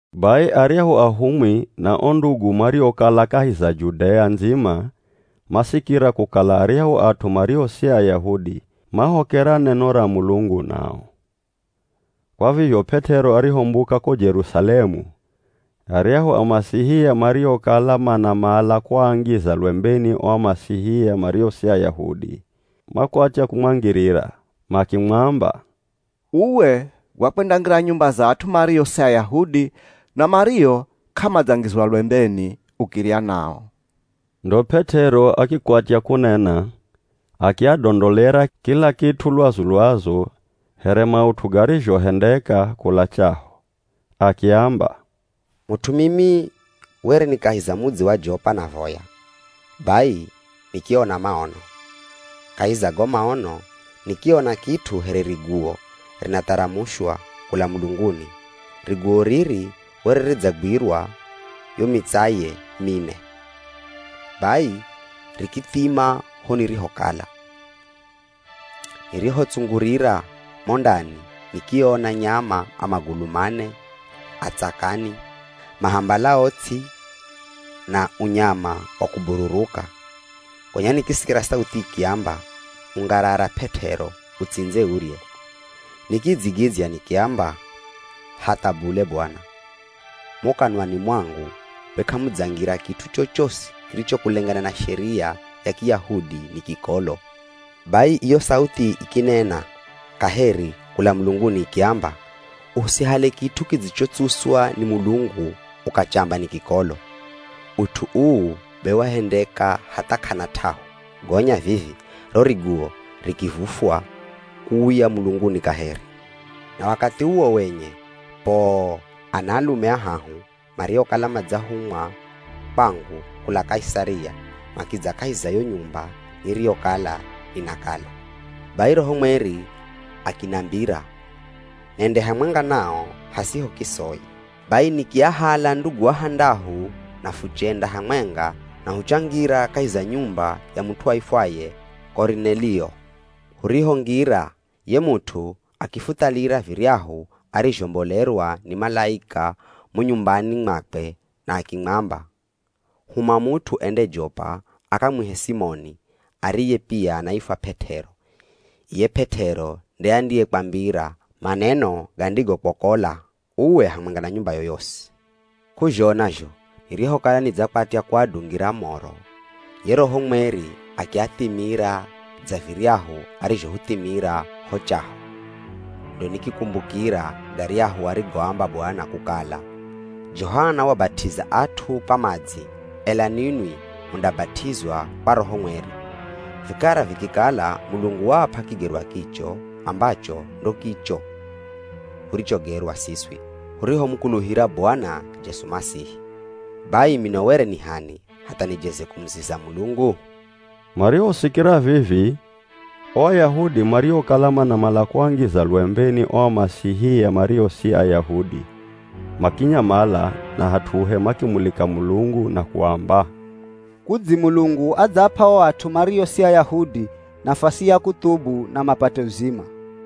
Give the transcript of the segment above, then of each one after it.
Bai aryahu ahumwi na o ndugu mariokala kahi za Judea ndzima, masikira kukala aryahu at'u mario si Ayahudi mahokera neno ra Mulungu nao. Kwa vizho P'et'ero arihombuka ko Jerusalemu, aryahu Amasihia mariokala manamala kuangiza lwembeni o Amasihia mario si Ayahudi, makwatya kumwangirira. Makimwamba, “Uwe wakwendangira nyumba za at'u mario si Ayahudi na mario k'amadzangizwa lwembeni, ukirya nao.” Ndo P'et'ero akikwatya kunena, akiadondolera kila kit'u lwazu-lwazu here maut'u garizhohendeka kula chaho. Akiamba, “Mut'u mimi were ni kahi za mudzi wa Jopa navoya, bai nikiona maono. Kahi za go maono nikiona kit'u here riguwo rinatharamushwa kula mulunguni. Riguwo riri were ridzagwirwa yo mitsaye mine, bai rikithima ho nirihokala. Nirihotsungurira mo ndani nikiona nyama a magulu mane, a tsakani, mahambalao ts'i na unyama wa kubururuka. Gonya nikisikira sauthi ikiamba, ‘Ungarara P'et'ero, utsindze urye.’ Nikidzigidzya nikiamba, ‘Hatha bule Bwana! Mo kanwani mwangu be k'amudzangira kit'u chochosi kiricho kulengana na sheria ya Kiyahudi ni kikolo.’ Bai iyo sauthi ikinena kaheri kula mulunguni ikiamba, ‘Usihale kit'u kidzichotsuswa ni Mulungu ukachamba ni kikolo.’ Ut'u uu be wahendeka hatha k'ana t'ahu gonya vivi ro riguwo rikivufwa kuuya mulunguni kaheri. “Na wakathi uwo wenye, poo, anaalume ahahu mariokala madzahumwa kwangu kula Kaisaria makidza kahi za yo nyumba niriyokala ninakala. Bai Roho Mweri akinambira nende hamwenga nao hasiho kisoi. Bai nikiahala ndugu ahandahu na fuchenda hamwenga na huchangira kahi za nyumba ya mut'u aifwaye Korinelio. Hurihongira, ye mut'u akifuthalira viryahu arizhombolerwa ni malaika mo nyumbani mwakwe na akimwamba, ‘Huma mut'u ende Jopa akamwihe Simoni ariye pia anaifwa P'et'ero. Iye P'et'ero nde andiyekwambira maneno gandigokwokola uwe hamwenga na nyumbayo yosi.’ “K'uzhona zho nirihokala nidzakwatya kuadungira moro, ye Roho Mweri akiathimira dza viryahu arizhohuthimira ho chaho. Ndo nikikumbukira garyahu arigoamba Bwana kukala, ‘Johana wabat'iza at'u kwa madzi, ela ninwi mundabat'izwa kwa Roho Mweri.’ Vikara vikikala Mulungu waap'a kigerwa kicho ambacho ndo kicho hurichogerwa siswi hurihomukuluhira Bwana Jesu Masihi. Bai mino were ni h'ani, hatha nijeze kumuziza Mulungu?” Marihosikira vivi, o Ayahudi mariokala manamala kuangiza lwembeni o Amasihia mario si Ayahudi makinyamala na hat'uhe makimulika Mulungu na kuamba, “Kudzi Mulungu adzaap'a o at'u mario si Ayahudi nafasi ya kuthubu na mapate uzima.”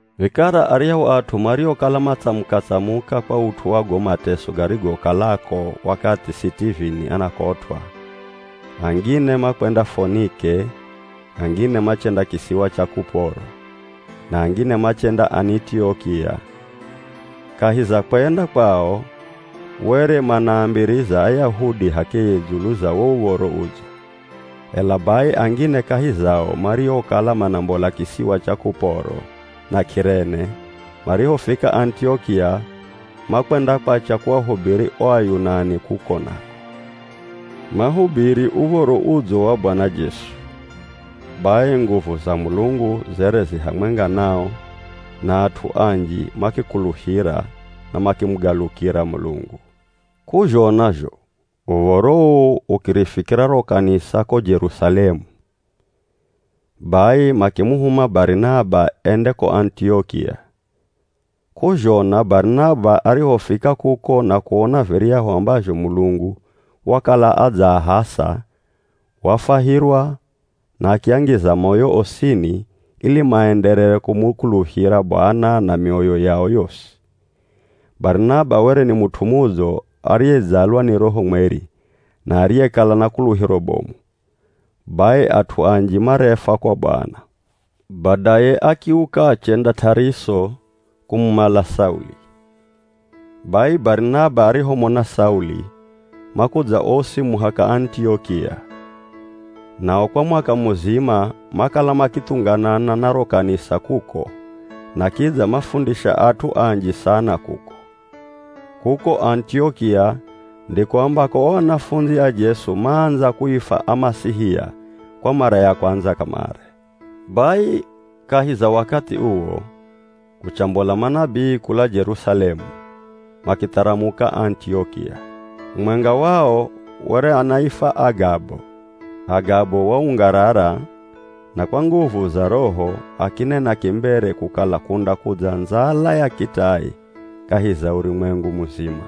Vikara aryahu at'u mariokala matsamuka-tsamuka kwa ut'u wa go mateso garigokalako wakathi Sitivini anakotw'a, angine makwenda Fonike, angine machenda kisiwa cha Kuporo, na angine machenda Anitiokia. Kahi za kwenda kwao, were manaambiriza Ayahudi h'akeye dzulu za wo Uv̱oro Udzo. Ela bai angine kahi zao, mariokala manambola kisiwa cha Kuporo na K'irene, marihofika Anitiokia makwendakwacha kuahubiri o Ayunani kuko nako. Mahubiri Uv̱oro Udzo wa Bwana Jesu. Bai nguvu za Mulungu zere zi hamwenga nao, na at'u anji makikuluhira na makimugalukira Mulungu. K'uzhona zho uv̱oro uu ukirifikira ro kanisa ko Jerusalemu, bai makimuhuma Barinaba ende ko Anitiokia. K'uzhona, Barinaba arihofika kuko na kuona viryahu ambazho Mulungu wakala adzaahasa, wafwahirwa na akiangiza moyo osini ili maenderere kumukuluhira Bwana na mioyo yao yosi. Barinaba were ni mut'u mudzo ariyedzalwa ni Roho Mweri na ariyekala na kuluhiro bomu. Bai at'u anji marefwa kwa Bwana. Badaye akiuka achenda T'ariso kumumala Sauli. Bai Barinaba arihomona Sauli makudza osi muhaka Anitiokia. Nao kwa mwaka muzima, makala makithunganana na ro kanisa kuko na kidza mafundisha at'u anji sana kuko. Kuko Anitiokia ndiko ambako o anafundzi a Jesu maandza kuifwa Amasihia kwa mara ya kwandza kamare. Bai kahi za wakathi uwo kuchambola manabii kula Jerusalemu makitharamuka Anitiokia. Mumwenga wao were anaifwa Agabo. Agabo waungarara na kwa nguvu za Roho akinena kimbere kukala kundakudza ndzala ya kitai kahi za urumwengu muzima.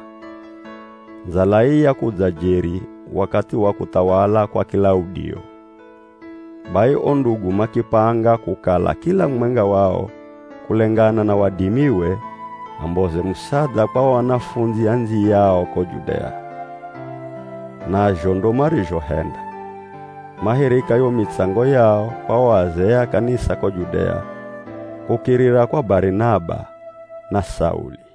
(Ndzala ii yakudza jeri wakathi wa kuthawala kwa Kilaudio.) Bai o ndugu makipanga kukala kila mumwenga wao kulengana na wadimiwe amboze musadha kwa o anafundzi andziyao ko Judea. Nazho ndo marizhohenda. Mahirika yo mitsango yao kwa o azee a kanisa ko Judea kukirira kwa Barinaba na Sauli.